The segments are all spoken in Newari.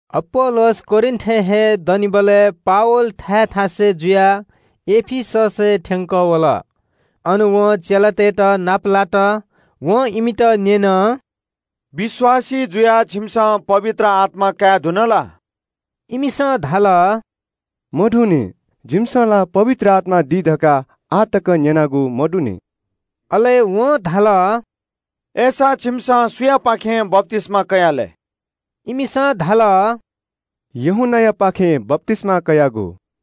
अपोल्‍लोस कोरिन्‍थय् हे दनिबलय् पावल थाय् थासय् जुयाः एफिससय् थ्‍यंकः वल। अन वं चेलातय्‌त नापलात। वं इमित न्‍यन – “विश्‍वासी जुयाः छिमिसं पवित्र आत्‍मा काये धुन ला?” इमिसं धाल – “मधुंनि। जिमिसं ला पवित्र आत्‍मा दी धकाः आः तकं न्‍यनागु मदुनि।” अले वं धाल – “अय्‌सा छिमिसं सुयापाखें बप्‍तिस्‍मा कयाः लय्?” इमिसं धाल – “यूहन्‍नायापाखें कयागु।”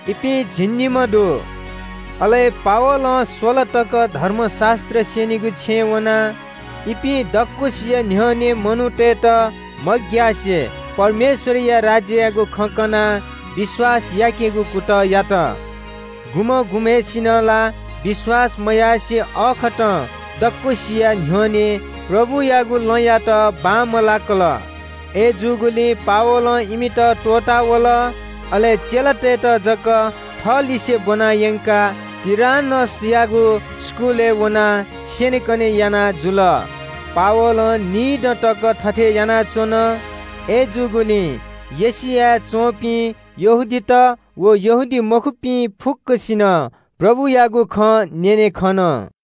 इपिं झिंनिम्‍ह ति दु। अले पावलं स्‍वला तक धर्मशास्‍त्र स्‍यनीगु छेँय् वनाः इपिं दक्‍वसिया न्‍ह्यःने मनूतय्‌त मग्‍यासे परमेश्‍वरया राज्‍ययागु खँ कनाः विश्‍वास याकेगु कुतः यात। गुम्‍हं गुम्‍हय्‌सिनं ला विश्‍वास मयासें अःखतं दक्‍वसिया न्‍ह्यःने प्रभुयागु लँयात बांमलाकल। अय्‌जूगुलिं पावलं इमित त्‍वःता वल। अले चेलातय्‌त जक थःलिसें ब्‍वना यंकाः टुरान्‍नसयागु इस्‍कुलय् वनाः स्‍यनेकने याना जुल। पावलं निदँ तक थथे यानाच्‍वन। अय्‌जूगुलिं एशियाय् च्‍वंपिं यहूदीत व यहूदीमखुपिं फुक्‍कसिनं प्रभुयागु खँ न्‍यने खन।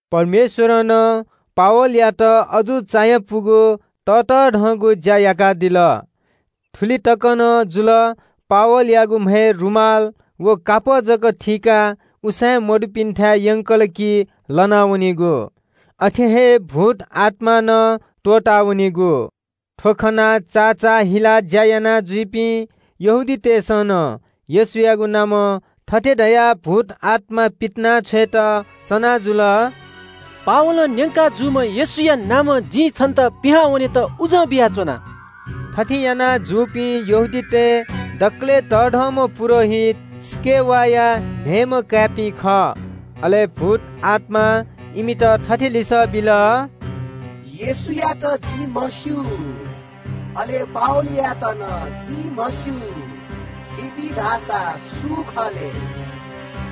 परमेश्‍वरं नं पावलयात अजू चायापुगु ततःधंगु ज्‍या याकादिल। थुलि तक नं जुल, पावलयागु म्‍हय् रुमाल व कापः जक थीकाः उसाँय्‌मदुपिन्‍थाय् यंकल कि लना वनीगु। अथे हे भूतआत्‍मां नं त्‍वःता वनीगु। थ्‍व खनाः चाचाःहिलाः झाँक्री ज्‍या यानाजुइपिं यहूदीतय्‌सं नं येशूयागु नामं थथे धयाः भूतआत्‍मा पितिनाछ्वयेत सना जुल – “पावलं न्‍यंका जूम्‍ह येशूया नामं जिं छन्‍त पिहां वनेत उजं बियाच्‍वना।” थथे याना जूपिं यहूदीतय् नायःतय् दकलय् तःधंम्‍ह पुजाहारी स्‍केवासया न्‍हय्‌म्‍ह काय्‌पिं खः। अले भूतआत्‍मां इमित थथे लिसः बिल – “येशूयात जिं म्‍हस्‍यू, अले पावलयात नं जिं म्‍हस्‍यू। छिपिं धाःसा सु खः लय्?”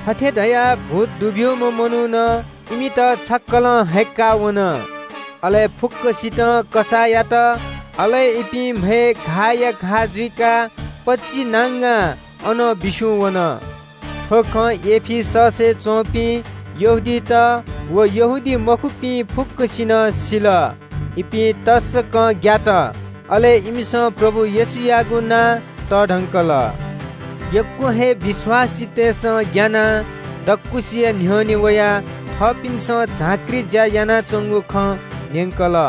थथे धयाः भूत दुब्‍यूम्‍ह मनुखं इमित छक्‍कलं हय्‌क्‍का वन, अले फुक्‍कसितं कसाः यात। अले इपिं म्‍हय् घाःया घाः जुइकाः पचिनांगां अनं बिस्‍युं वन। थ्‍व खँ एफिससय् च्‍वंपिं यहूदीत व यहूदीमखुपिं फुक्‍कसिनं सिल। इपिं तसकं ग्‍यात। अले इमिसं प्रभु येशूयागु नां तःधंकल। यक्‍व हे विश्‍वासीतय्‌सं ग्‍यानाः दक्‍वसिया न्‍ह्यःने वयाः थःपिन्‍सं झाँक्री ज्‍या यानाच्‍वंगु खँ न्‍यंकल।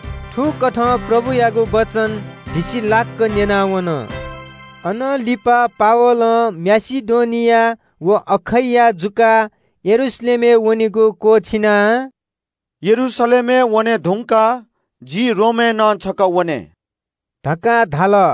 थुकथं प्रभुयागु वचन धिसिलाक्‍क न्‍यनावन। अनं लिपा पावलं माकेडोनिया व अखैया जुयाः यरूशलेमय् वनेगु क्‍वःछिनाः – “यरूशलेमय् वने धुंकाः जि रोमय् नं छकः वने” धकाः धाल।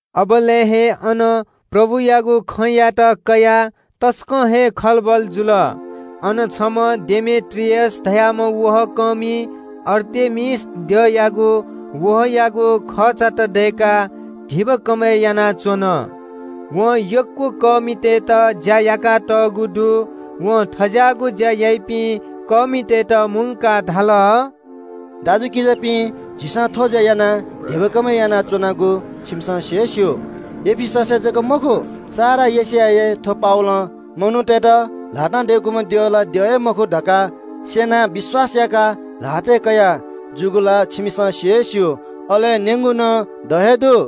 अबलय् हे अन प्रभुयागु खँयात कयाः तसकं हे खलबल जुल। अन छम्‍ह डेमेत्रियस धाःम्‍ह वहः कःमिं आर्तेमिस द्यःमय्‌जुयागु वहःयागु खःचात दय्‌काः धिबा कमय् यानाच्‍वन। वं यक्‍व वहःकःमितय्‌त ज्‍या याकातःगु दु। वं थज्‍याःगु ज्‍या याइपिं वहःकःमितय्‌त मुंकाः धाल – “दाजुकिजापिं, झीसं थ्‍व ज्‍या यानाः धिबा कमय् यानाच्‍वनागु छिकपिन्‍सं सि हे स्‍यू। एफिससय् जक मखु, सारा एशियाय् हे थ्‍व पावलं मनूतय्‌त ल्‍हातं दय्‌कूम्‍ह द्यः ला द्यः हे मखु धकाः स्‍यनाः विश्‍वास याकाः ल्‍हातय्‌ कया जूगु ला छिकपिन्‍सं सि हे स्‍यू, अले न्‍यंगु नं द हे दु।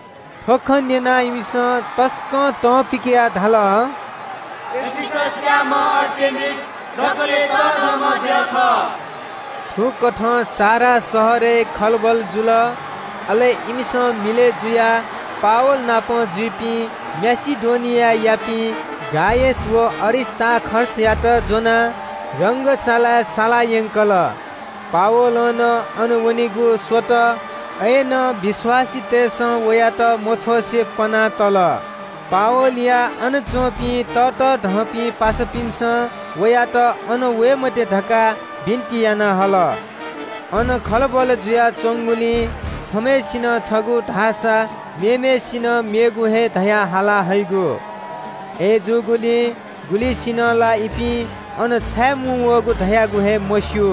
थ्‍व खँ न्‍यनाः इमिसं तसकं तं पिकयाः धाल – “एफिससयाम्‍ह आर्तेमिस दकलय् तःधंम्‍ह द्यः खः।” थुकथं सारा शहरय् खलबल जुल। अले इमिसं मिलय् जुयाः पावल नाप जुइपिं माकेडोनियायापिं गायस व अरिस्‍तार्खसयात ज्‍वनाः रंगशालाय् साला यंकल। पावलं नं अन वनेगु स्‍वत, अय्‌नं विश्‍वासीतय्‌सं वयात मछ्वसे पना तल। पावलया अन च्‍वंपिं ततःधंपिं पासापिन्‍सं वयात अन वये मते धकाः बिन्‍ति याना हल। अन खलबल जुयाच्‍वंगुलिं छम्‍हय्‌सिनं छगू धाःसा मेम्‍हय्‌सिनं मेगु हे धयाः हाला हइगु। अय्‌जूगुलिं गुलिसिनं ला इपिं अन छाये मुंवःगु धयागु हे मस्‍यू।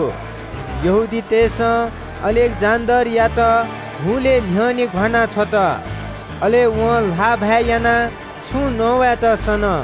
यहूदीतय्‌सं अलेक्‍जेन्‍डरयात हुलय् न्‍ह्यःने घ्‍वाना छ्वल। अले वं ल्‍हाःभाय् यानाः छुं नवायेत सन।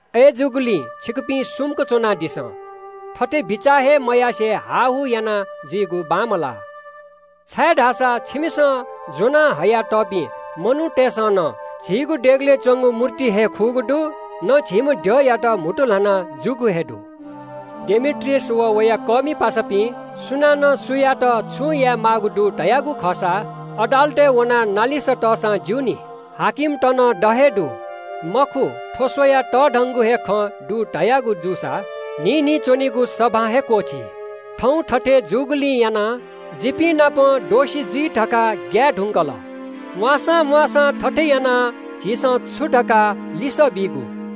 अय्‌जूगुलिं छिकपिं सुम्‍क च्‍वनादिसँ, थथे बिचाः हे मयासें हाःहू यानाजुइगु बांमलाः, छाय्‌धाःसा छिकपिन्‍सं ज्‍वना हयातःपिं मनूतय्‌सं न झीगु देगलय् च्‍वंगु मूर्ति हे खुगू दु, न झीम्‍ह द्यःमय्‌जुयात म्‍हुतु ल्‍हाना जूगु हे दु। “डेमेत्रियस व वया ज्‍याकःमि पासापिं सुनानं सुयातं छुं यायेमाःगु दु धयागु खःसा अदालतय् वनाः नालिस तःसां ज्‍यूनि। हाकिमत नं द हे दु। मखु थ्‍व स्‍वयाः तःधंगु हे खँ दु धयागु जूसा न्‍हिं न्‍हिं च्‍वनीगु सभां हे क्‍वःछी। थौं थथे जूगुलिं दोष जिमित लाइ धकाः ग्‍याये धुन। म्‍वाःसां म्‍वाःसां थथे यानाः झीसं छु धकाः लिसः बीगु?”